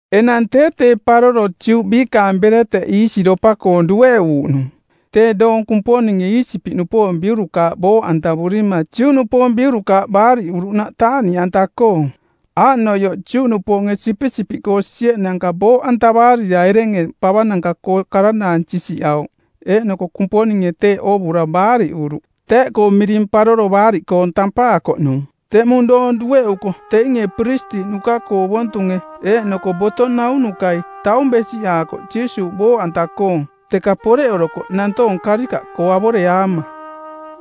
Enang tee tee paroro Juꞌ biikaang bereteꞌ iisiropa-koong dueꞌuuꞌnung, tee doong Kumponinge Iisipiꞌnupoong biurukaaꞌ booꞌantavurima Juꞌnupoong biurukaaꞌ baariꞌuruꞌnaꞌ taaꞌniꞌanta-koong. Aaꞌnoioꞌ Juꞌnupoonge sipisipiꞌkoo sieꞌnanka booꞌantavaarira erenge pavananka-koo karanaang sisiꞌauꞌ eeꞌnoko Kumponinge teeꞌ oovura baariꞌuruꞌ. Teeꞌkoo miring Paroro Baariꞌkoong˜ tampaakoꞌnung. Teꞌmung doong dueꞌuko teinge piristiꞌnuka-koo ovontunge eeꞌnoko boto naunukai taung besiꞌaakoꞌ Jiisuuꞌ booꞌanta-koong, teka poreꞌorokoꞌ nantoong karikaꞌkoo avoreaama.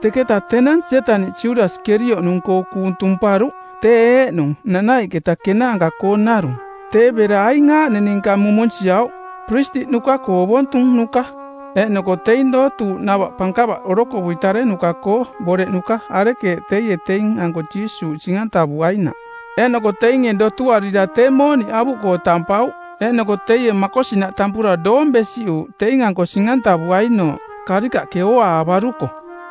Teketa tenang Sietaniꞌ Judasi Kerioꞌnung-koo kuung tumparuꞌ tee eeꞌnung nanaiꞌketa kenaanka-koong narung. Tee bera aing aaꞌning ninka mumunsiauꞌ: piristiꞌnuka-koo ovontunuka eeꞌnoko teing dootuuꞌnava pankava orokovui tarenuka˜koo boreꞌnuka arekeeꞌ teie teing-anko Jiisuuꞌ sing-antavuainaꞌ. Eeꞌnoko teinge dotuarira tee mooniꞌ avuꞌkoo tampauꞌ. Eeꞌnoko teie makosinaꞌ tampura doong besiꞌuuꞌ teing-anko sing-antavuainooꞌ karikaꞌke ooaavaruko.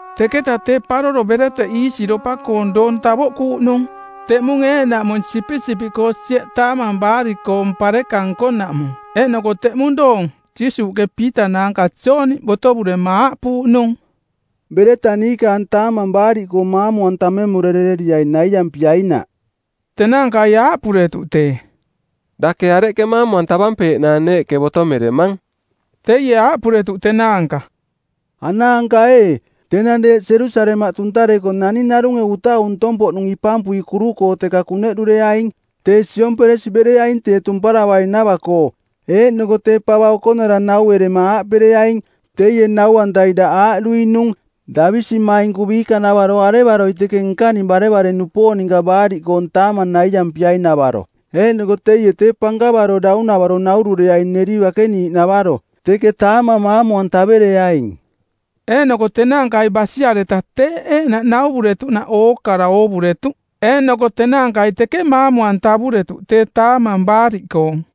Teketa tee Paroro Bereteꞌ Iisiropa-koong doong tavoꞌkuuꞌnung, teꞌmung eeꞌnaꞌmung sipisipiꞌkoo sieꞌ Taamang Baariꞌkoong pareka nkonaꞌmung. Eeꞌnoko teꞌmung doong Jiisuuꞌke Piita naanka Jooni botovurema aaꞌpuuꞌnung, “Bereta niikaang Taamang Baariꞌkoong maamu-antamemurereriai naiampiainaꞌ.” Tenaankai aaꞌpuretuꞌ tee, “Dake areꞌke maamu-antavampeeꞌnaang neeꞌke botomeremang?” Teie aaꞌpuretuꞌ tenaanka, “Anaanka ee, tenang deeꞌ Jerusalemaꞌ tuntareko naning narunge utau ntong-poꞌnung ipampui kuru-koo teka kuneꞌdureaing. Tee siomperesi bereaing tee tumparavainava-koo. Eeꞌnoko tee pava okonara nauerema aaꞌpereaing, ‘Teie nau-antai daꞌ aaꞌduinung, “Davisimainku biikanavaro arevaroi teke nkaning barevare-nupoong ninka Baariꞌkoong Taamang naiampiai-navaro?” ’ Eeꞌnoko teie tee pankavaro daunavaro naurureaing neri bakeniiꞌnavaro. Teke taamang maamu-antavereaing.” Eeꞌnoko tenaankai basiareta teeꞌ eeꞌnaꞌ nauvuretuꞌnaꞌ ookara oovuretuꞌ, eeꞌnoko tenaankai teke maamu-antavuretuꞌ tee Taamang Baariꞌkoong.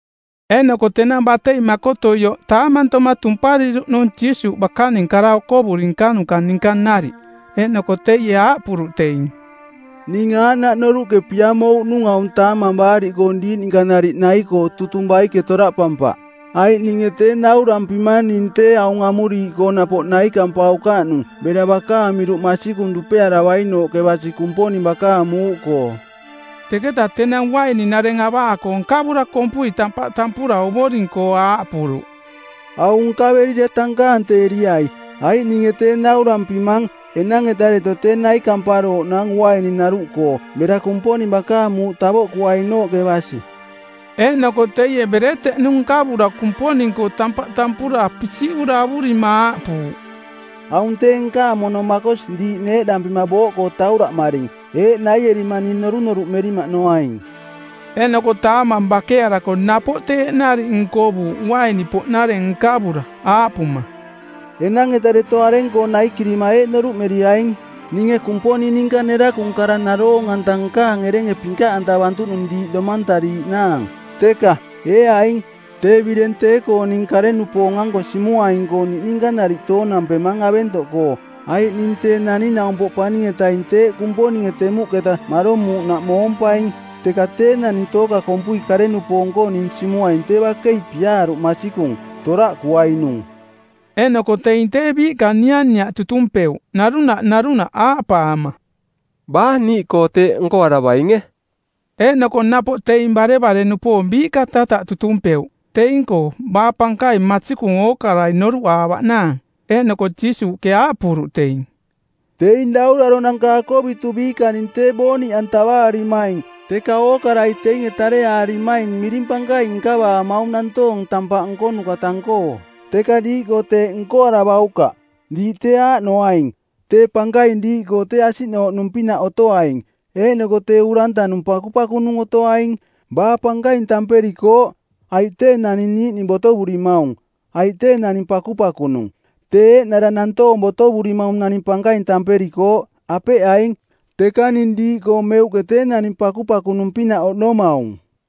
Eeꞌnoko tenang batei makotuioꞌ taamantoma tumpariruꞌnung Jiisuuꞌ bakaning kara okovuri nkanuka ninka nariꞌ. Eeꞌnoko teie aaꞌpuruꞌ teing, “Ning aaꞌnaꞌ noruꞌke piamouꞌnung aung Taamang Baariꞌkoong diiꞌ ninka nariꞌ nai-koo tutung baike toraꞌpampaꞌ, Aiꞌ ninge tee naurampimang ning tee aung amuriiꞌkoo napoꞌ naikampaukaꞌnung bera bakaang miruꞌ masikung dupearavainooꞌke basi Kumponing bakaang muuꞌkoo.” Teketaꞌ tenang uaininareng avaako nkavura kompui tampaꞌ tampura Ovoring-koo aaꞌpuruꞌ, “Aung nkaverira tankaanteeriai, Aiꞌ ninge tee naurampimang enang-eta deto tee naikamparooꞌnaang uaininaruꞌkoo bera Kumponing bakaang muuꞌ tavoꞌkuainooꞌke basi.” Eeꞌnoko teie bereteꞌnu nkavura Kumponing-koo tampaꞌ tampura pisiꞌura avurima aaꞌpuuꞌ, “Aung tee nkaang mono makosi diiꞌ neeꞌdampima booꞌkoo tauraꞌmaring. Eeꞌ naierima ning norunoruꞌmerimaꞌnoaing.” Eeꞌnoko taamang bakearako napoꞌ teeꞌ nariꞌ nkovuuꞌ uaini-poꞌnareng nkavura, aaꞌpuma, “Enang-eta deto areng-koo naikirima eeꞌ noruꞌmeriaing: Ninge Kumponing ninka nerakung kara naroong-anta nkaang erenge pinkaꞌantavantuꞌnung diiꞌ domantariiꞌnaang. Teka, ee aing, tee bireng tee-koong ning kare-nupoong-anko simuaing-koong niꞌninka nariꞌ toonampemang aventoꞌkoo. Aiꞌ ning Tee Naning-naumpoꞌ Paning-etaing teeꞌ Kumponinge temuꞌketa maromuuꞌnaꞌ moompaing, teka tee naning tooka kompui kare-nupoong-koo ning simuaing tee bakei piaaruꞌ masikung, toraꞌkuainung.” Eeꞌnoko teing tee biiꞌka nianiaꞌ tutumpeuꞌ narunaꞌ narunaꞌ, aaꞌpaama, “Baa niiꞌkoo teeꞌ nkoaravainge?” Eeꞌnoko napoꞌ teing barevare-nupoong biiꞌka tataꞌ tutumpeuꞌ teing-koo baa pankaing masikung ookarai noruꞌaavaꞌnaang. Eeꞌnoko Jiisuuꞌke aaꞌpuruꞌ teing, “Teing dauraronanka akovitu biikaning tee booniꞌantavaarimaing teka ookarai teinge tareaarimaing miring pankaing nkavaamaung nantoong tampaꞌ nkonuka tang-koong. Teka diiꞌkoo teeꞌ nkoaravaukaꞌ. Diiꞌ tee aaꞌnoaing, tee pankaing diiꞌkoo tee asiꞌnooꞌnung-pinaꞌ otoaing, eeꞌnoko tee urantanung pakupakunung otoaing. Baa pankaing tamperikooꞌ, aiꞌ tee naning niiꞌning botovurimaung, aiꞌ tee naning pakupakunung? Tee eeꞌnara nantoong botovurimaung naning pankaing tamperikooꞌ, apeꞌ aing? Teka ning diiꞌkoo meuꞌke tee naning pakupakunung-pinaꞌ oꞌnomaung.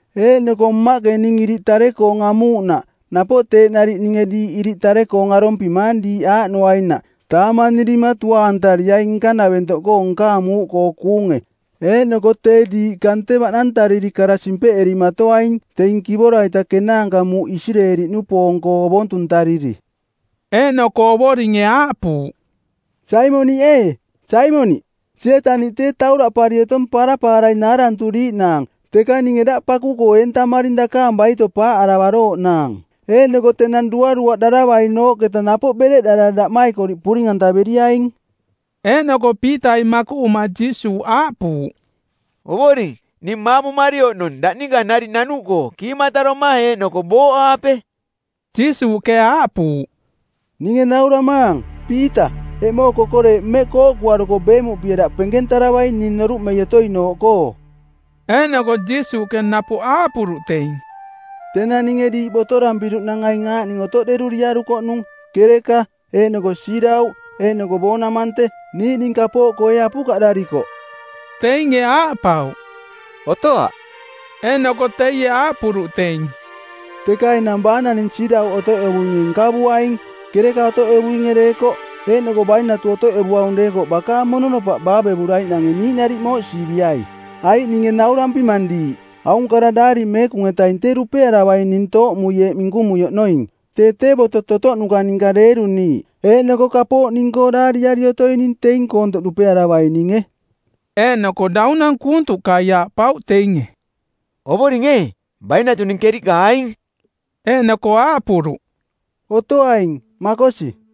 Eeꞌnoko Mmaꞌke ning iriꞌ tare-koong amuuꞌnaꞌ napoꞌ teeꞌ nariꞌ ninge diiꞌ iriꞌ tare-koong arompimaang diiꞌ aaꞌnoainaꞌ taamanirima tuaantariai nkanaventoꞌkoo nkaang muuꞌkoo kuunge; Eeꞌnoko tee diiꞌ kante baꞌnantariri kara simpeꞌerimaatoaing teing kivora-ita kenaanka muuꞌ Isireeli-nupoong-koo ovontuntariri.” Eeꞌnoko Ovoringe aaꞌpuuꞌ, “Saimoniꞌ ee, Saimoniꞌ, Sietaniꞌ tee tauraꞌpari otong parapaarai naaranturiiꞌnaang; Teka ninge daꞌ paku-koo eentamaring dakaang baito paaꞌaravarooꞌnaang. Eeꞌnoko tenang duaruaꞌdaravainooꞌketa napoꞌ bereꞌdarara daꞌmaikoriꞌ puring antaveriaing.” Eeꞌnoko Piitai makuꞌuma Jiisuuꞌ aaꞌpuuꞌ, “Ovoring, ning maamumari oꞌnong daꞌ ninka nariꞌ nanuꞌkoo kiimataroma eeꞌnoko booꞌaape.” Jiisuuꞌke aaꞌpuuꞌ, “Ninge nauramaang, Piita, eꞌmoong kokoreeꞌ mmeꞌ kooꞌkuaruko beemuꞌpie daꞌ penkentaravaing ning noruꞌmei otoinooꞌkoo.” Eeꞌnoko Jiisuuꞌke napoꞌ aaꞌpuruꞌ teing, “Tenang ninge diiꞌ botorampiruꞌnang aing aaꞌning otoꞌderuriarukoꞌnung: kereka, eeꞌnoko siirauꞌ eeꞌnoko boonamante˜, niiꞌning kapooꞌkoo ee apukaꞌdarikoꞌ?” Teinge aaꞌpauꞌ, “Otoaꞌ.” Eeꞌnoko teie aaꞌpuruꞌ teing, “Teka enang baa naning siirauꞌ otoꞌevuinge nkavuaing, kereka otoꞌevuinge deekoꞌ. Eeꞌnoko bainatu otoꞌevuaung deekoꞌ bakaang mononopaꞌ baavevuraiꞌnange niiꞌnariꞌ mooꞌsiiviai. Aiꞌ ninge naurampimang diiꞌ, aung kara Daari Meekung-etaing tee dupearavaing ning tooꞌmui eeꞌ minkumui oꞌnoing, ‘Tee tee boto-totoꞌnuka ninka deeruniiꞌ.’ Eeꞌnoko kapooꞌ ning-koo daariari otoining teing koontoꞌ dupearavaininge.” Eeꞌnoko daunang kuuntuꞌkai aaꞌpauꞌ teinge, “Ovoring ee, bainatuning keriꞌka aing.” Eeꞌnoko aaꞌpuruꞌ, “Otoaing, makosi.”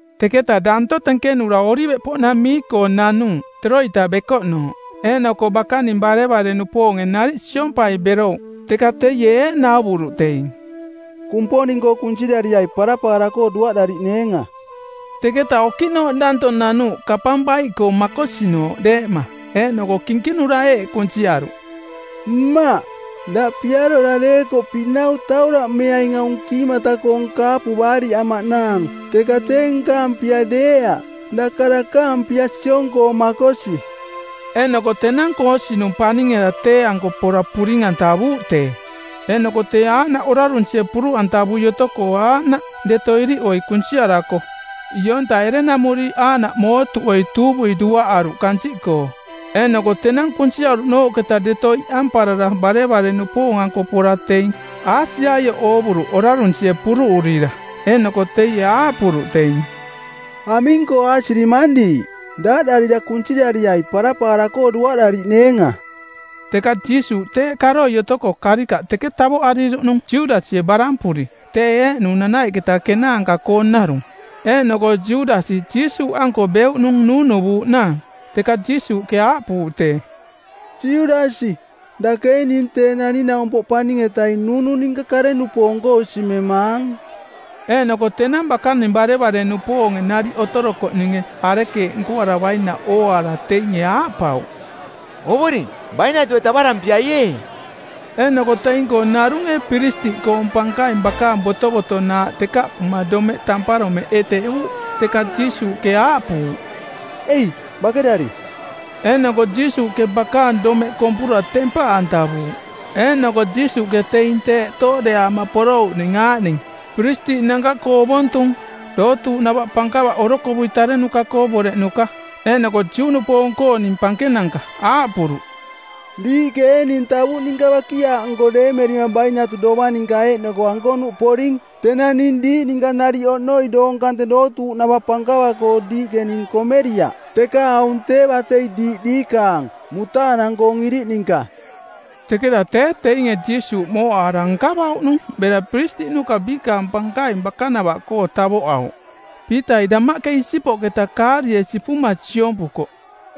Teketa danto tenkenura Oliveꞌpoꞌnamii-koo nanuuꞌ, teroita bekoꞌnooꞌ. Eeꞌnoko bakaning barevare-nupoonge nariꞌ siompai berouꞌ. Teka teie eeꞌ nauvuruꞌ teing, “Kumponing-koo kunsirariai parapaara-koo duaꞌdariꞌneenga.” Teketa okiꞌnooꞌ danto nanuuꞌ kapang baiꞌkoo makosinooꞌ deeꞌma, eeꞌnoko kinkinura eeꞌ kunsiaruꞌ, “Mmaꞌ, daꞌ piarora deekoꞌ pinau tauraꞌmeaing aung kiimata-koong kaapu baariꞌamaꞌnaang, teka tee nkaang pia deeaꞌ, daka dakaang pia siong-koo makosi.” Eeꞌnoko tenang koosinung˜ paning-eta tee-anko pora puring-antavuuꞌ tee. Eeꞌnoko tee aaꞌnaꞌ orarunsie puruꞌantavui otoko aaꞌnaꞌ deto iriꞌoi kunsiarako ionta erenamuriiꞌ aaꞌnaꞌ mootuꞌoi tuuvui duaꞌaruꞌ kansiꞌkoo. Eeꞌnoko tenang kunsiaruꞌnooꞌketa deto iꞌamparara barevare-nupoong-anko pora teing aasiaioꞌ oovuruꞌ orarunsie puruꞌurira. Eeꞌnoko teie aaꞌpuruꞌ teing, “Aming-koo aasirimang diiꞌ? Daaꞌdarira kunsirariai parapaara-koo duaꞌdariꞌneenga.” Teka Jiisuuꞌ teeꞌ karoi otoko karikaꞌ teke tavoꞌariruꞌnung Judasie barampuri, tee eeꞌnung nanaiꞌketa kenaanka-koong narung. Eeꞌnoko Judasi Jiisuuꞌanko beuꞌnung nuunuvuuꞌnaang. Teka Jiisuuꞌke aaꞌpuuꞌ tee, “Judasi, dake ee ning Tee Naning-naumpoꞌ Paning-etaing nuunu ninka kare-nupoong-koo simemaang?” Eeꞌnoko tenang bakaning barevare-nupoonge nariꞌ otorokoꞌninge arekeeꞌ nkoaravainaꞌ ooaara teinge aaꞌpauꞌ, “Ovoring, bainatue tavarampiai ee?” Eeꞌnoko teing-koo narunge piristiꞌkoong pankaing bakaang botovotonaaꞌ tekaꞌpuma domeꞌ tamparomeꞌ eteꞌuuꞌ. Teka Jiisuuꞌke aaꞌpuuꞌ, “Ei, bakerari.” Eeꞌnoko Jiisuuꞌke bakaang domeꞌ kompura tempaꞌantavuuꞌ. Eeꞌnoko Jiisuuꞌke teing tee tooꞌdeaama porouꞌning aaꞌning: piristiꞌnanka-koo ovontung, dootuuꞌnava pankava orokovui tarenuka˜koo boreꞌnuka eeꞌnoko Juꞌnupoong-kooning pankenanka aaꞌpuruꞌ, “Diiꞌke ee ning tavuꞌ ninka bakiaaꞌnko deemerima bainatu dovang ninka eeꞌnoko ankonuꞌ poring? Tenang ning diiꞌ ninka nariꞌ oꞌnoi doong kante dootuuꞌnava pankava-koo ning diiꞌke komeriaꞌ, teka aung tee batei diiꞌ diikaang, mutaanang-koong iriꞌ ninka.” Teketa tee teinge Jiisuuꞌ mooꞌaara nkavauꞌnung bera piristiꞌnuka biikaang pankaing bakanavaꞌkoo tavoꞌauꞌ. Piitai damaꞌke isipoꞌketa kaarie sipuma siompukoꞌ.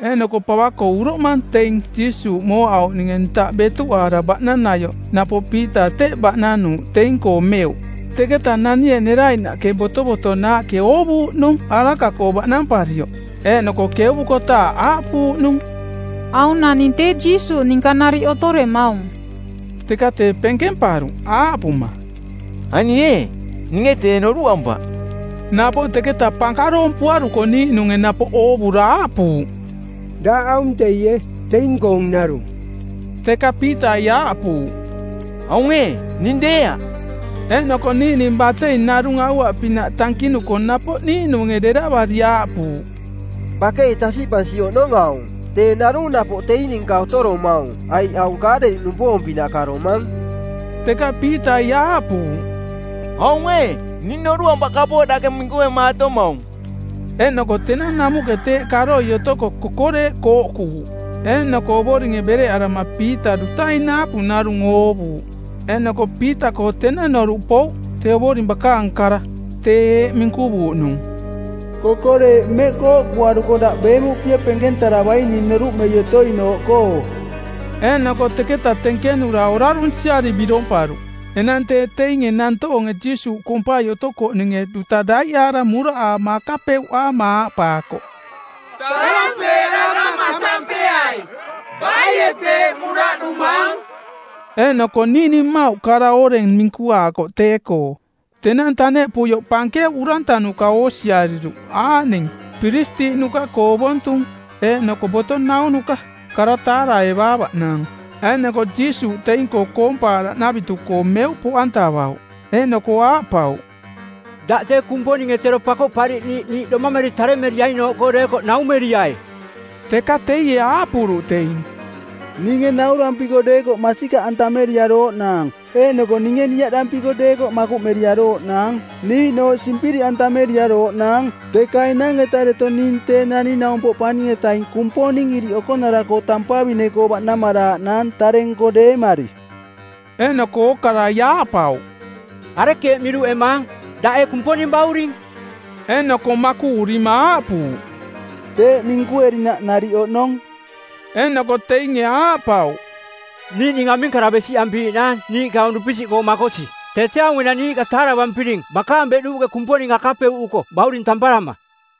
Eeꞌnoko pava-koo uroꞌmang teing Jiisuuꞌ mooꞌauꞌninge ntaꞌ betuꞌaara baꞌnaniaioꞌ napoꞌ Piita teꞌ baꞌnanuuꞌ teing-koo meuꞌ. Teketaꞌ nanie neraiꞌnaꞌke botovotonaaꞌke oovuuꞌnung araka-koo baꞌnamparioꞌ, eeꞌnoko keuvukotaaꞌ aaꞌpuuꞌnung, “Aung naning tee Jiisuuꞌ ninka nariꞌ otoremaung.” Teka tee penkemparuꞌ, aaꞌpuma, “Ani ee, ninge tee noruꞌampaꞌ.” Napoꞌ teketa pankaroompuaruko niiꞌnunge napoꞌ oovura aaꞌpuuꞌ, “Daꞌ aung teie, teing-koong narung.” Teka Piitai aaꞌpuuꞌ, “Aung ee, ning deeaꞌ.” Eeꞌnoko niiꞌning batei narung aua-pinaꞌ tankinuko, napoꞌ niiꞌnunge deravari aaꞌpuuꞌ, “Bakei tasiꞌpansi oꞌnong aung, tee narung napoꞌ teing ninka otoromaung, aiꞌ aung Kaaleliꞌnupoong-pinaꞌ karomang.” Teka Piitai aaꞌpuuꞌ, “Aung ee, ning noruꞌampaꞌ kapooꞌ dake minkuemaatomaung.” Eeꞌnoko tenang namuꞌke teeꞌ karoi otoko kokoreeꞌ kooꞌkuuꞌ. Eeꞌnoko Ovoringe bereꞌarama Piita dutai naapu narung oovuuꞌ. Eeꞌnoko Piita-koo tenang noruꞌkoo pouꞌ tee Ovoring bakaang kara tee eeꞌ minkuvuuꞌnung, “Kokoreeꞌ mmeꞌ kooꞌkuaruko daꞌ beemuꞌpie penkentaravaing ning noruꞌmei otoinooꞌkoo.” Eeꞌnoko teketa tenkenura orarunsiari biromparuꞌ. Enang tee teinge nantoonge Jiisuuꞌ kompai otokoꞌninge duta daiꞌaara muraꞌaama akapeuꞌaama aaꞌpaakoꞌ, “Tarampeerarama˜ tampeai baie teeꞌ muraꞌdumaang?” Eeꞌnoko niiꞌning mmauꞌ kara oreng minkuaakoꞌ tee-koo. Tenang taneꞌpuioꞌ pankeuꞌ urantanuka oosiariruꞌ aaꞌning: piristiꞌnuka-koo ovontung eeꞌnoko boto naunuka kara taaraevaavaꞌnaang, eeꞌnoko Jiisuuꞌ teing-koo koompaaraꞌnavitu-koo meuꞌ poꞌantavauꞌ. Eeꞌnoko aaꞌpauꞌ, “Daꞌ tee Kumponinge tero Pakoꞌpariꞌniiꞌ niiꞌ domameri taremeriainooꞌkoo deekoꞌ naumeriai!” Teka teie aaꞌpuruꞌ teing, “Ninge naurampiko deekoꞌ masikaꞌantameriarooꞌ naang. Eeꞌnoko ninge niaꞌdampiko deekoꞌ makuꞌmeriarooꞌnaang, niiꞌnooꞌ simpiriꞌantameriarooꞌnaang. Teka enang-eta deto tee ning Tee Naning-naumpoꞌ Paning-etaing Kumponing Iriꞌ Okonara-koo tampavine-koo baꞌnamaraaꞌnaang tare-nko deemari.” Eeꞌnoko ookarai aaꞌpauꞌ, “Arekeeꞌ miruꞌemaang? Daꞌ ee Kumponing Bauring?” Eeꞌnoko makuꞌurima aaꞌpuuꞌ, “Teeꞌ minkuerinaꞌ nariꞌ oꞌnong.” Eeꞌnoko teinge aaꞌpauꞌ, “Niiꞌning aming kara besiꞌampiiꞌnaang niiꞌke aung dupisiꞌkoo makosi? Tee tee aung enang niiꞌka taaravampiring bakaang beꞌduuꞌke Kumponing akapeuꞌuko bauring tamparama!”